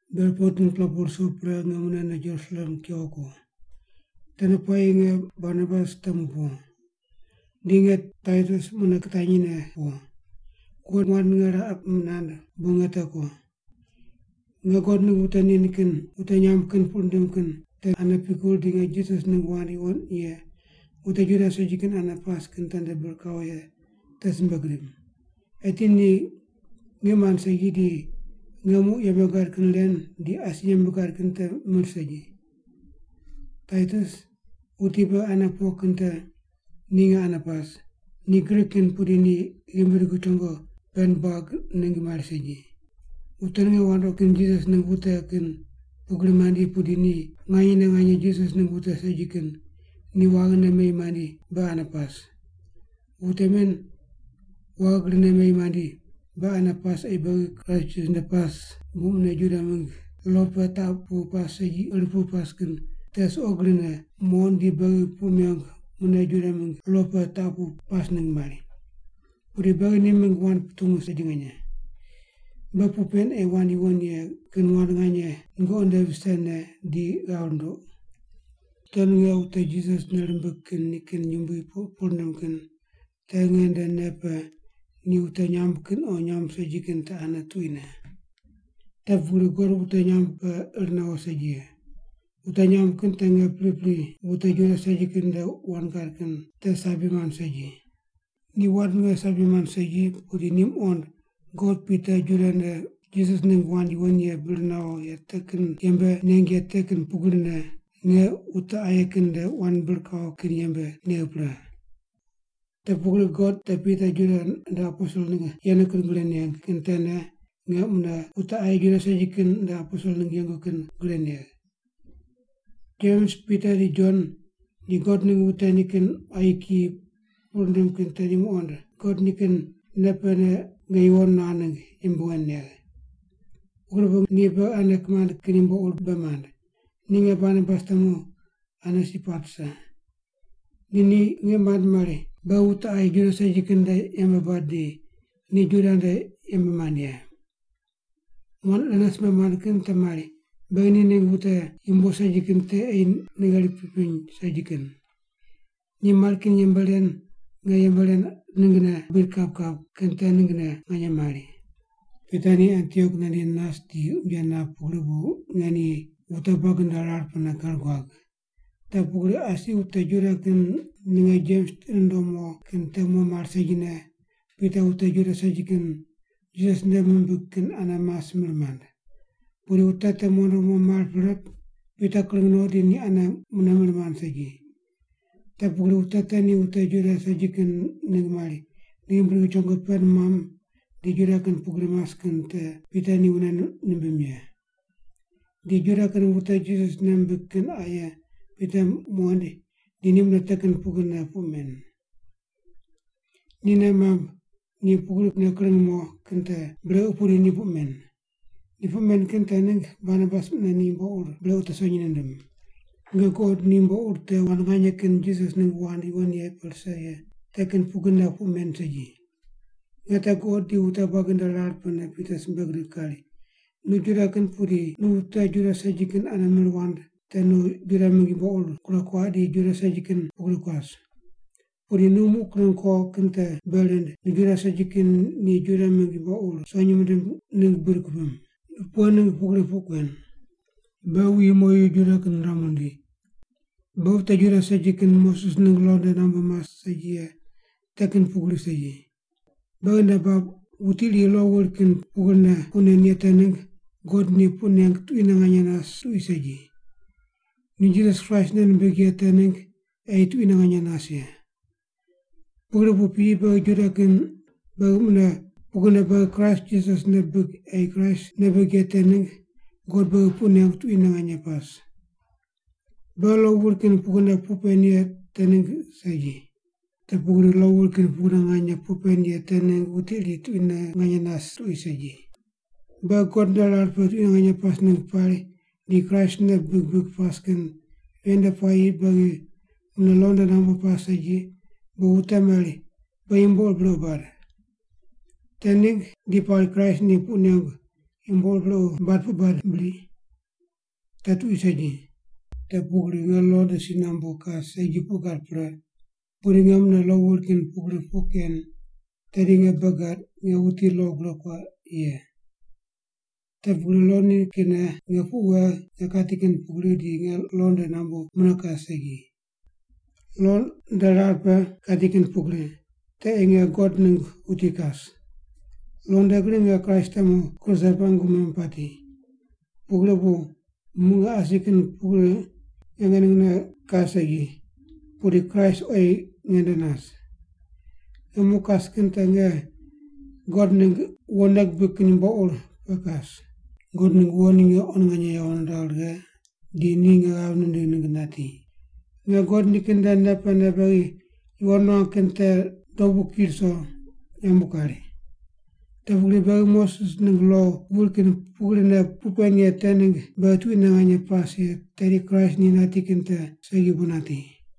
Ber 14-pela pu ruso pre nge munene Jerusalem kewo ko. Tende puayi nge Barnabas temu po. Di nge Taitus mune kitanyi ne po. God wand ninge raqe nand bu nge te ko. Nge God ningg wute nikin wute nyamb kin puq rindim kin tene ane pikur di nge Jisas ningg wand yuwon ye wute Juda segi kin ane pas kin tende bir kawo ye te simbe gidim. Eti ni ngiq mand segi di nge muq yembe gad kin ren di asi yembe gad kin te mir segi. Taitus, wuti beghi ane po kin te, ni nge ane pas, ni Grik kin pudi ni ghimbi dugu chongo pend buag ningg mari segi. Wute ninge wandoqi mand Jisas ningg wute kin pugri mandi pudi ni nganyene nganye Jisas ningg wute segi kin ni waghine meyi mandi beghi ane pas. Wute men waghi grine meyi mandi beghi ane pas ei beghi Kraist Jisas nde pas bu mune Juda mingg lo pe taq pu pas segi ir pu pas kin te suqo grine muqond di beghi puq mengu mune Juda mingg lo pe taq pu pas ningg mari. Pudi beghi ni mingg wand putungu segi nganye. Beghi puq pen ei wand yuwon ye kin wand nganye nungoqi nde visene di ghav runduq. Wute ninge wute Jisas nei rimbig kin nikin yumbui puq rindim kin te nge nde nei pe ni wute nyamb kin o nyamb segi kin te ane tuquine. Te pugri God wute nyamb pe ir nawo segi ye. Wute nyamb kin te nge pripri wute Juda segi kin nde wand gad kin te sabi mand segi. Ni wand ninge sabi mand segi pudi ni muqond God Pita Juda nde Jisas ningg wand yuwon ye bir nawo ye te kin yembe neng ye te kin pugrine nge wute aye kin nde wand bir kawo kin yembe negh pre. Te pugri God te Pita Juda nde aposel ningg yenu kin gre neng kin tene nge mune wute aye Juda segi kin nde aposel ningg yengu kin gre negh. Jems, Pita di Jon, ni God ningg wute nikin quayi kiyi puq rindim kin te ni muqond God nikin nei pene nge yuwon nuagh ningg yembe wen negh. Pugri bu ni beghi ane kimand kin yumbo ur bei mand, ni nge Barnabas temu ane si pat rise. Di ni ngiq mand mari beghi wute aye Juda segi kin nde yembe bad di ni Juda nde yembe mand ye. Wand irene simbe mand kin te mari beghi ni ningg wute yumbo segi kin te ei nei gheri pipiny segi kin. Ni mari kin yembe ren nge yembe ren ninggne qa buid kap kap kin te ninggne nganye mari. Pita ni Antiok nandi nas di unje nap pugri bu nge ni wute buagi nde rar pene ker guag. Te pugri asi wute Juda kin ninge Jems tiqi nundom mo kin te mo mar segine Pita wute Juda segi kin Jisas nei mimbig kin ane mas mir mand. Pudi wute te mondo mo mar pre Pita kring no di ni ane mune mir mand segi. Te pugri wute te ni wute Juda segi kin ningg mari ni ghimbi dugu chongo pend muam di Juda kin pugri mas kin te Pita ni wune nimbim ye. Di Juda kin wute Jisas nei mimbig kin aye Pita muqoind di ni mune te kin pugrine puq men. Ni nei mamb ni pugrine kring mo kin te brequ pudi ni puq men. Ni puq men kin te ningg Barnabas mune ni yumbo ur brequ te sonyi nindim. Nge guqod ni yumbo ur te wand nganye kin Jisas ningg wand yuwon ye pe rise ye te kin pugrine puq men segi. Nge te guqod di wute buagi nde rar pene Pita simbe gidig kari, “Nu Juda kin pudi nu wute Juda segi kin ane mir wand te nu Juda mingg yumbo ur gure kuaq di Juda segi kin pugri kuas. Pudi nu muq kring kuo kin te bei rind nu Juda segi kin ni Juda mingg yumbo ur sonyi mindim ningg buid kupim. Nu pughe ningg pugri puq kuen? “Beghi wuyi moyu Juda kin riramu rindi, beghi wute Juda segi kin Moses ningg lo nde nambu mas segi ye te kin pugri segi. Beghi nei bab wuti iri lo wuri kin pugrine puq nen ye te ningg God ni puq neng tuquine nganye nas tuqui segi. Ni Jisas Kraist nei nimbig ye te ningg ei tuquine nganye nas ye. Pugri bu piyi beghi Juda kin beghi mune pugrine beghi Kraist Jisas nei bibig ei Kraist nei bibig ye te ningg God beghi puq nengu tuquine nganye pas. Beghi lo wuri kin pugrine puq pen ye te ningg segi. Te pugri lo wuri kin pugrine nganye puq pen ye te ningg wuti iri tuquine nganye nas tuqui segi. Beghi God nde rar pe tuquine pas ningg pari di Kraist nei bibig bibig pas kin ven nde puayi beghi mune lo nde nambu pas segi bu wute mari beghi yumbo ur brequ bad. Te ningg di pari Kraist ni puq nengu yumbo ur brequ bad puq bad bri? Te tuqui segi. Te pugri nge lo nde si nambu kas segi puq gad pre pudi nge mune lo wuri kin pugri puq ken tedi nge bei gad nge wuti lo gure kuaq ye. Te pugri lo nikinne nge puq wegh nge kati kin pugri di nge lo nde nambu mune kas segi. Lo nde rar pe kati kin pugri, te ei nge God ningg wuti kas. Lo nde gri nge Kraist temu kruse pe qungu memu pati, pugri bu muq nge asi kin pugri nge ningne kas segi, pudi Kraist oyi nge nde nas. Nge muq kas kin te nge God ningg wo nei gibig kin yumbo ur pe kas. God ningg wo ni nge quan nganye yawo niragh righe di ni nge ghav nindigh ningg nati. Nge God nikin nde nei pene beghi yuwon nuangu kin te dobu ki ruso yambu kari. Te pugri beghi Moses ningg lo wuri kin pugrine puq pen ye te ningg beghi tuquine nganye pas ye tedi Kraist ni nati kin te segi bu nati.”